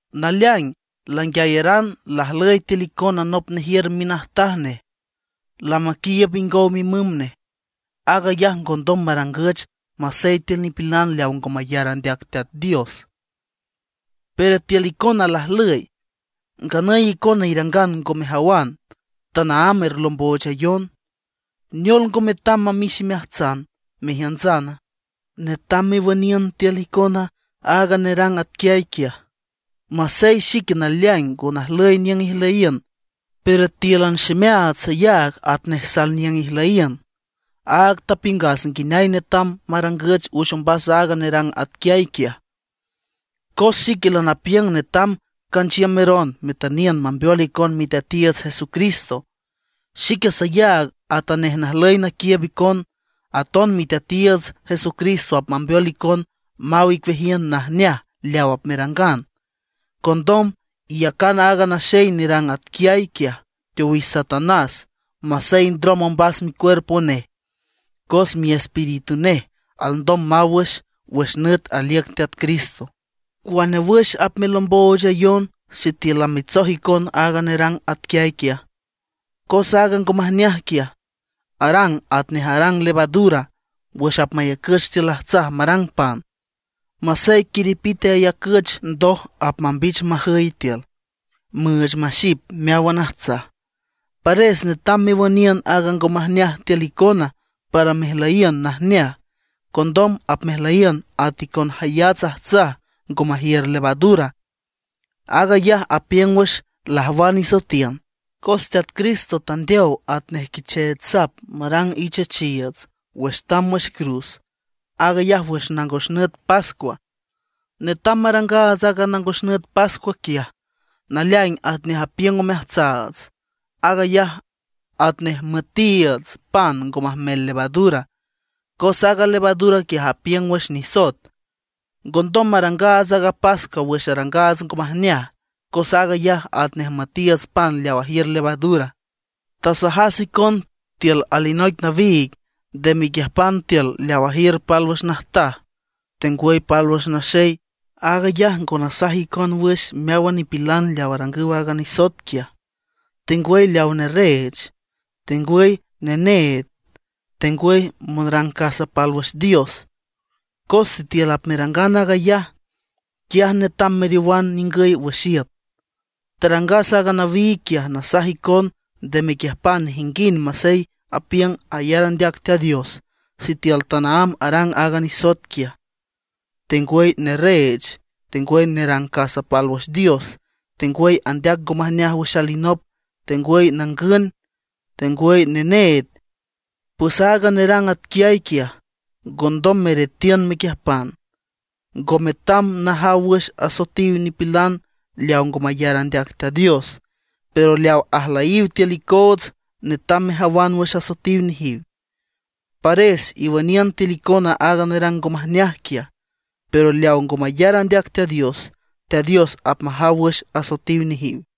Naleaing languiayaran lajlüy tiül icona nop nejiür minajtaj nej, lamaquiiüb ingow mimüm nej. Aag ayaj ngondom marangüch masey tiül nipilan leaw ngo mayar andeac Teat Dios, pero tiül icona lajlüy. ¡Nganüy icona irangan ngo mejawan, tanaámb erlomboochayon! ¿Neol, ngo metam mamix imeajtsana, mejiüntsana? Netam mewüniün tiül icona aaga nerang atquiay quiaj. Masey xique naleaing ngo najlüy niüng ijlüyiün, pero tíülan ximeaats sayaag atnej salniüng ijlüyiün. Áag tapiüngas nguineay netam marangüch wüx ombas aaga nerang atquiay quiaj. Cos xique lanapiüng netam canchiümeron metüniün mambeol icon Miteatiiüts Jesucristo. Xique sayaag atanej najlüy naquiiüb icon, aton Miteatiiüts Jesucristo apmambeol icon maw icueajiün najneaj leaw apmerangan. Condom, iyacan aaga naxey nerang atquiay quiaj teowix Satanás masey ndrom ombas micuerpo nej, cos miespíritu nej alndom maw wüx, wüx nüt aliüc Teat Cristo. ¿Cuane wüx apmelomboochayon sitiül lamitsoj icon aaga nerang atquiay quiaj? Cos aaga ngo majneaj quiaj arang atnej arang levadura wüx apmayacüch tiül ajtsaj marang pan. Masey quiripite ayacüch, ndoj apmambich majüy tiül, müüch maxip meáwan ajtsaj. Pares netam mewüniün aaga ngo majneaj tiül icona para mejlüyiün najneaj. Condom apmejlüyiün at icon jayats ajtsaj ngo majiür levadura. Aag ayaj apiüng wüx lajwan isoetiün, cos Teat Cristo tandeow atnej quichech sap marang ichechiiüts wüx tamb wüx cruz, aag ayaj wüx nangos nüt pascua. Netam marangaats aaga nangos nüt pascua quiaj, naleaing atnej apiüng omeajtsaats. Aag ayaj atnej müetiiüts pan ngo majmel levadura, cos aaga levadura quiaj apiüng wüx nisoet. Ngondom marangaats aaga pascua wüx arangaats ngo majneaj, cos aag ayaj atnej müetiiüts pan leaw ajiür levadura. Tasajas icon tiül alinoic nawiig, nde mequiüjpan tiül leaw ajiürüw pálwüx najtaj tengwüy pálwüx naxey. Aag ayaj ngo nasaj icon wüx meáwan nipilan leaw arangüw aaga nisoet quiaj, tengwüy leaw nerreech, tengwüy neneed, tengwüy monrang casa pálwüx dios. Cos sitiül apmerangan aag ayaj, quiaj netam meriowan ningüy wüx iüt. Tarangas aaga nawiig quiaj nasaj icon nde mequiüjpan nejinguind masey apiüng ayar andeac Teat Dios, sitiül tanaámb arang aaga nisoet quiaj; tengwüy nerreech, tengwüy nerang casa pálwüx dios, tengwüy andeac ngo majneaj wüx alinop, tengwüy nangün, tengwüy neneed. Pues aaga nerang atquiay quiaj, ngondom meretiün mequiüjpan. Ngo metam najaw wüx asoetiw nipilan leaw ngo mayar andeac Teat Dios, pero leaw ajlüyiw tiül icoots netam mejawan wüx asoetiw nejiw. Pares iwüniün tiül icona aaga nerang ngo majneaj quiaj. Pero leaw ngo mayar andeac Teat Dios, Teat Dios apmajaw wüx asoetiw nejiw.